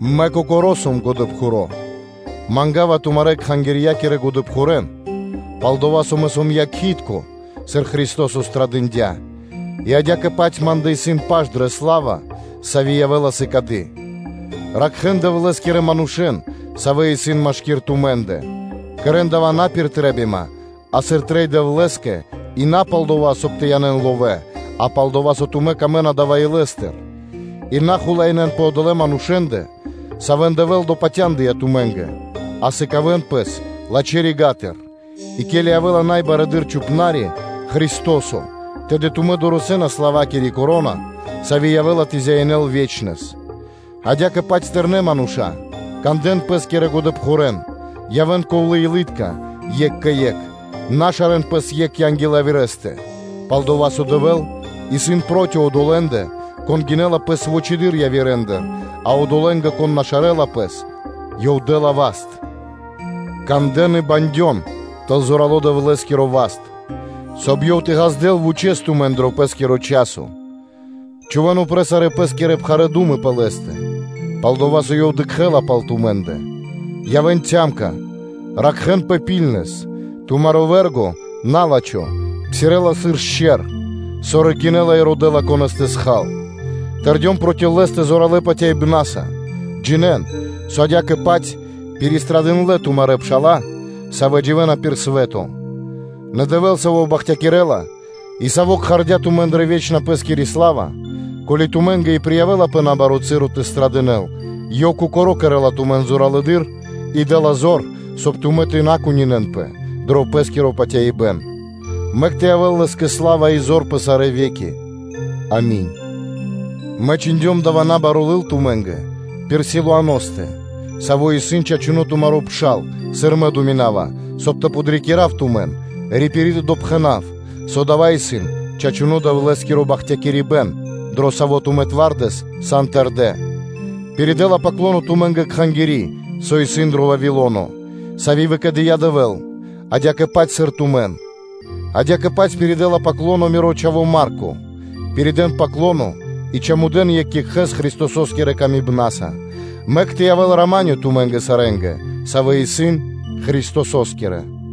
Мэ, кокоро́ сом годэпхуро́ и пастырё (чхупна́ри), манга́ва тумарэ́ кхангирья́кирэ годэпхурэн и пастырен, пал-дова́ со мэ сом якхи́тко, сыр Христо́со пирилыджия пхарипэ́н, адя́кэ-паць ма́ндэ исын паш дрэ сла́ва, сави́ явэ́ла сыкады: ракхэ́н Дэвлэ́скирэ манушэ́н, савэ́ исын машки́р тумэ́ндэ, кэрэ́н дава́ на пир трэ́бима, а сыр трэй Дэвлэ́скэ и на пал дова́, со тумэ́ сорбы сан бокхалэ́ кэ ловэ́, а пал-дова́ со тумэ́ камэ́на дава́ илэ́стыр; и на хулаинэн пэ одолэ́ манушэ́ндэ, савэ́н Дэвэ́л допатяндыя тумэ́нгэ, а сыкавэ́н пэс лачхэ́ рига́тыр. И ке́ли явэ́ла Са́мо Барэды́р Пастырё (Чхупна́ри), Христо́со, тэды тумэ́ дорэсэ́на славакири коро́на, сави́ явэ́ла тэ зяинэл ве́чнэс. Адя́кэ-паць, тэрнэ́ мануша́лэ, кандэ́н пэ́скирэ годэпхурэн, явэ́н ковлэ́-илы́тка екх кэ екх, на шарэ́н пэс екх анги́л явирэ́стэ, пал-дова́ со Дэвэ́л исын проти одолэ́ндэ, кон гинэ́ла пэс вучэды́р явирэндыр, а одолэ́нгэ, кон на шарэла пэс, Ёв дэ́ла васт. Кандэ́н и бандён тэл зорало́ Дэвлэ́скиро васт, соб (кай) Ёв тэ ґаздэл вучэ́с тумэн дро Пэ́скиро часо; чхувэ́н упрэ́ сарэ́ пэ́скирэ пхарэ́ ду́мы пэ Лэ́стэ, пал-дова́ со Ёв дыкхэ́ла пал тумэ́ндэ. Явэ́н трезва (ны́рна), ракхэ́нпэ. Тумаро вэ́рго, на́лачхо, псирэ́ла сыр шчэр (ле́во), саво́ рыкинэла и родэ́ла, конэ́с тэ хал. Тэрдён проти лэ́стэ зоралэ́ патяибна́са, джинэ́н, со адя́кэ-паць пиристрадындлэ тумарэ́ пша́ла, савэ́ дживэ́на пир свэ́то. Нэ Дэвэ́л, Саво́ бахтякирэ́ла, и Саво́ кхардя́ тумэн дрэ вечна Пэ́скири сла́ва, ко́ли тумэ́нгэ и приявэлапэ набаро́ часо тэ страдынэл, Ёв Кокоро́ кэрэ́ла тумэн зоралэды́р и дэ́ла зор, соб (кай) тумэ́ тэ на кунинэнпэ дро пэ́скиро патяибэ́н; мэк тэ явэ́л Лэ́скэ сла́ва и зор пэ сарэ́ ве́ки. Ами́нь. Мэ чхиндём дава́ набаро́ лыл тумэ́нгэ пир Силуаностэ, саво́ исын чачуно́ тумаро́ пшал, сыр мэ думинава, соб (кай) тэ подрикирав тумэн, рипири тэ допхэнав, со дава́ исын чачуно́ Дэвлэ́скиро бахтякирибэ́н, дро саво́ тумэ́ зоралэ́с сан тэрдэ́. Пиридэла “паклоно” тумэ́нгэ кхангири́, со исын дро Вавило́но, Сави́ выкэдыя́ Дэвэ́л, адя́кэ-паць, сыр тумэн. Адя́кэ-паць пиридэла “паклоно” миро чхаво́ Марко. Пиридэ́н “паклоно” и чамудэн екх екхэ́с Христосо́скирэ ласкаса. Мэк тэ явэ́л рама́нё (миро) тумэ́нгэ сарэ́нгэ, савэ́ исын Христосо́скирэ. Ами́нь.